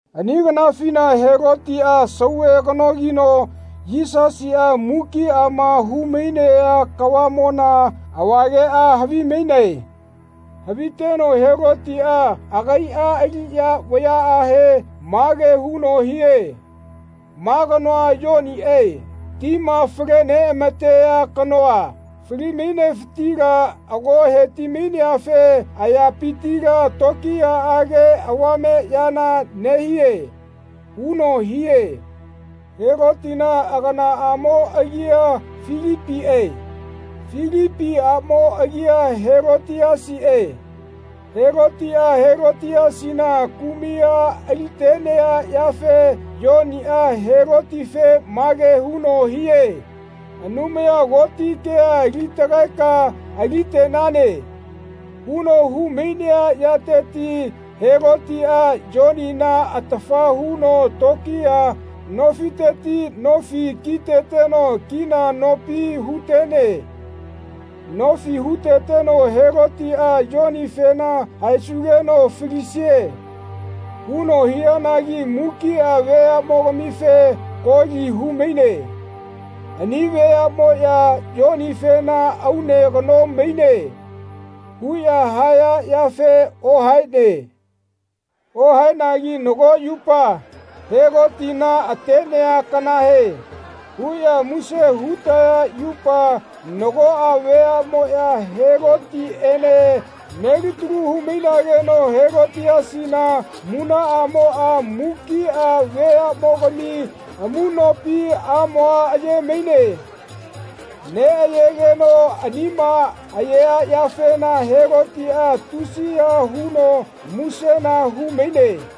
Ani kanafina Helotiꞌa sauve kanogino Yisasiꞌa mukiꞌama hu-mainea kavaꞌmona avageꞌa havimaine. Haviteno Helotiꞌa agaiꞌa aliꞌya vayaꞌahe mage huno hie “Ma kanoa Yoniꞌe, tima fale-neꞌama-tea kanoa, fali-mainefitila ago heti-maineafe ayapitila tokiyaꞌage avame yana nehie.” huno hie. Helotina aganaꞌamo agia Filipiꞌe. Filipi aꞌmo agia Helotiasiꞌe. Helotiꞌa Helotiasina kumai a ali-tenea yafe Yoniꞌa Helotife mage huno hie “Anumaya Koti kea ali-tagaeka ali-tenane.” huno hu-mainea yateti Helotiꞌa Yonina atafa huno tokiya nofiteti nofi kiteteno kina nopi hu-tene. Nofi huteteno Helotiꞌa Yonifena “Haesugeno falisie.” huno hianagi mukiꞌa veaꞌmogamife koli hu-maine. Ani veaꞌmoꞌya Yonifena “Aune kano maine.” huꞌya haya yafe ohaene. Ohaenegi nago yupa, Helotina atenea kanahe, huꞌya muse hu-taya yupa nagoꞌa veaꞌmoꞌya Helotiꞌene melitalu hu-mainageno Helotiasina munaꞌamoꞌa mukiꞌa veaꞌmogami amuꞌnopi amoa aye-maine. Neꞌayegeno anima ayea yafena Helotiꞌa tusiya huno musena hu-maine.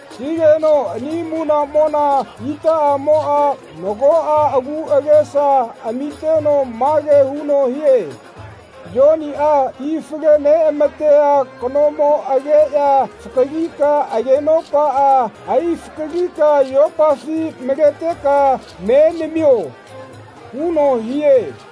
Higeno ani munaꞌmona itaꞌamoꞌa nagoꞌa agu agesa amiteno mage huno hie “Yoniꞌa ti fale-neꞌama-tea kanomo ageꞌya fakalika agenopaꞌa ai-fakalika yopafi maleteka me namio.” huno hie.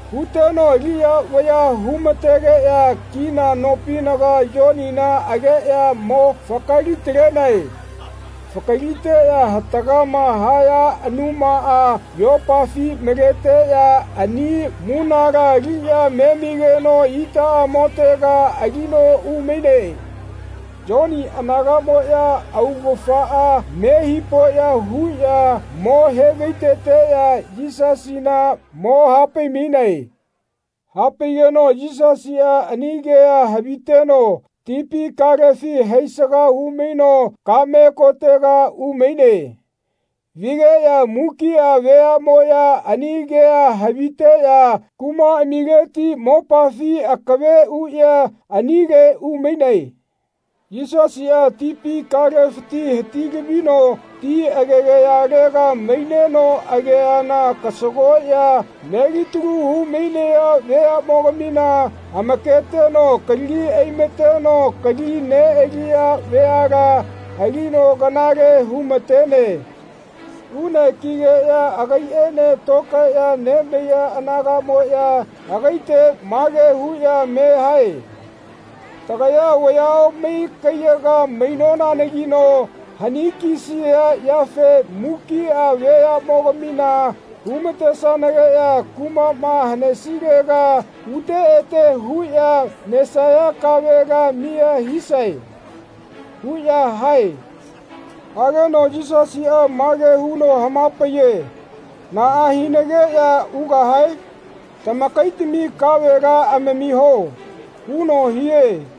Huteno aliꞌya vayaꞌa hu-mategeꞌya kina nopinaga Yonina ageꞌya mo fakali-talenae. Fakaliteꞌya hatagama haya anumaꞌa yopafi maleteꞌya ani munala aliꞌya memigeno itaꞌamotega alino umaine. Yoni anagaꞌmoꞌya augafaꞌa me hipoꞌya huꞌya mo he-vai-teteꞌya Yisasina mo hapai-mainae. Hapaigeno Yisasiꞌa ani kea haviteno tipi kalefi haisaga hu-maino kaꞌme kotega umaine. Vigeꞌya mukiꞌa veaꞌmoꞌya ani kea haviteꞌya kumaꞌamileti mopafi akave uꞌya anile umainae. Yisasiꞌa tipi kalefiti hati-lavino ti agegayalaga maineno ageana kasagoꞌya melitalu hu-mainaya veaꞌmogamina amaketeno kalagi ai-mateno kali neꞌaliya veala alino kanale hu-ma-tene. Une kigeꞌya agaiꞌene tokaeꞌya nemaiya anagaꞌmoꞌya agaite mage huꞌya me hae “Tagaya vaya omai kaiyaga mainonanagino hani-kisia yafe mukiꞌa veaꞌmogamina hu-ma-tesanageꞌya kumaꞌma hanesilega ute ete huꞌya nesaya kavela miya hisae.” huꞌya hae. Hageno Yisasiꞌa mage huno hama-paiye “Naꞌa hinageꞌya ugahae? Tamakaitami kavela amamiho.” huno hie.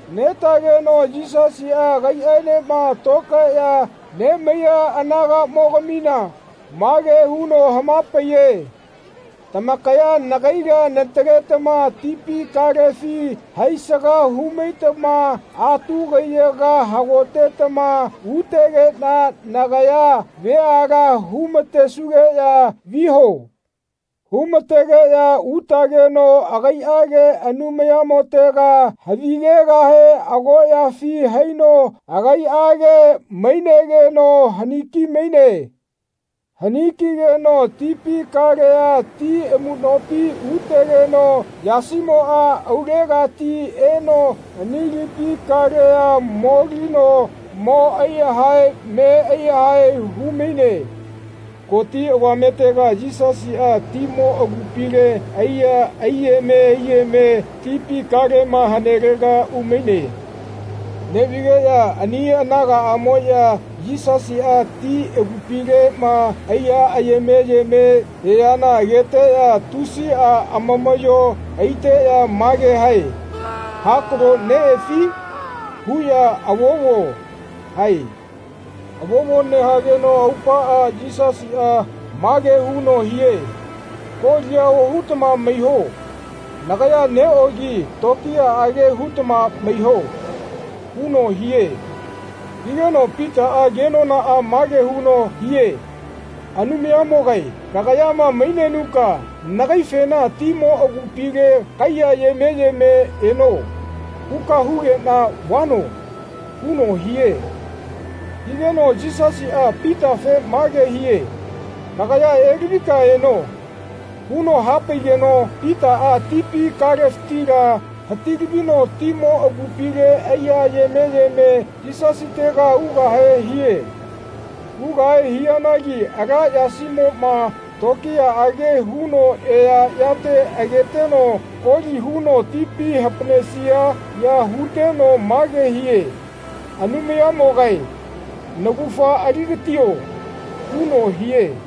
Netageno Yisasiꞌa agaiꞌaenema tokaeꞌya nemaiya anagaꞌmogamina mage huno hama-paiye “Tamakaya nagaila nataletama tipi kalefi haisaga hu-maitama atu kaiyaga hagotetama utegeꞌna nagaya veala hu-ma-tesugeꞌya viho.” Hu-ma-tegeꞌya utageno agaiꞌage Anumayamotega havigegahe agoꞌyafi haino agaiꞌage mainegeno hani-ki-maine. Hani-ki-geno tipi kalea ti amuꞌnopi utegeno yasimoꞌa aulegati eno ani lipi kalea molino mo ai-yahae me ai-yahae hu-maine. Koti avametega Yisasiꞌa timo agupile aiya aiyeme aiyeme tipi kalema hanelega umaine. Neꞌvigeꞌya ani anagaꞌmoꞌya Yisasiꞌa ti agupileꞌma aiya ayeme ayeme eaꞌyana ageteꞌya tusiꞌa amamaꞌyo aiteꞌya mage hae “Hakalo neꞌefi?” huꞌya “Avovo.” hae. Avovo nehageno aupaꞌa Yisasiꞌa mage huno hie “Kolia ohutama maiho. Nagaya neꞌogi tokiyaꞌage hutama maiho.” huno hie. Higeno Pitaꞌa kenonaꞌa mage huno hie “Anumayamogae kagayama mainenuka nagaifena ‘Timo agupile kaiya ayeme yeme eno.’ huka hugeꞌna vano.” huno hie. Higeno Yisasiꞌa Pitafe mage hie “Kagaya elavika eno.” huno hapaigeno Pitaꞌa tipi kalefitila hati-lavino timo agupile aiya ayeme yeme Yisasitega ugahe hie. Ugahe hianagi ala yasimoꞌma tokiyaꞌage huno eaꞌyate ageteno koli huno tipi hapaꞌnesia ya huteno mage hie “Anumayamogae naugafa ali-gatio.” huno hie.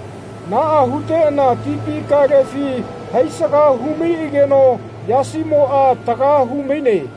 Naꞌa huteꞌana tipi kalefi haisaga hu-maiꞌageno yasimoꞌa taga hu-maine.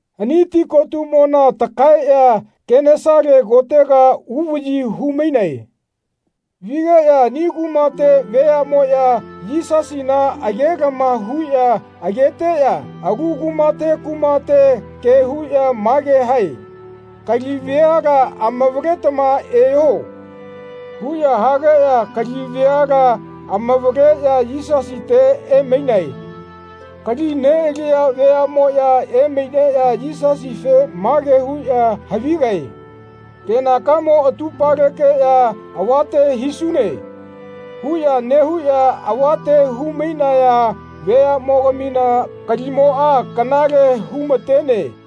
Ani ti kotuꞌmona takaeꞌya Kenesale kotega uvaꞌyi hu-mainae. Vigeꞌya ani kumate veaꞌmoꞌya Yisasina age-lama huꞌya ageteꞌya alu kumate kumate ke huꞌya mage hae “Kali veala amavaletama eho.” huꞌya hageꞌya kali veala amavaleꞌya Yisasite emainae. Kali neꞌaliya veaꞌmoꞌya emaineꞌya Yisasife mage huꞌya havigae “Kenakamo atupalekeꞌya avate hisune.” huꞌya nehuꞌya avate hu-mainaya veaꞌmogamina kalimoꞌa kanale hu-ma-tene.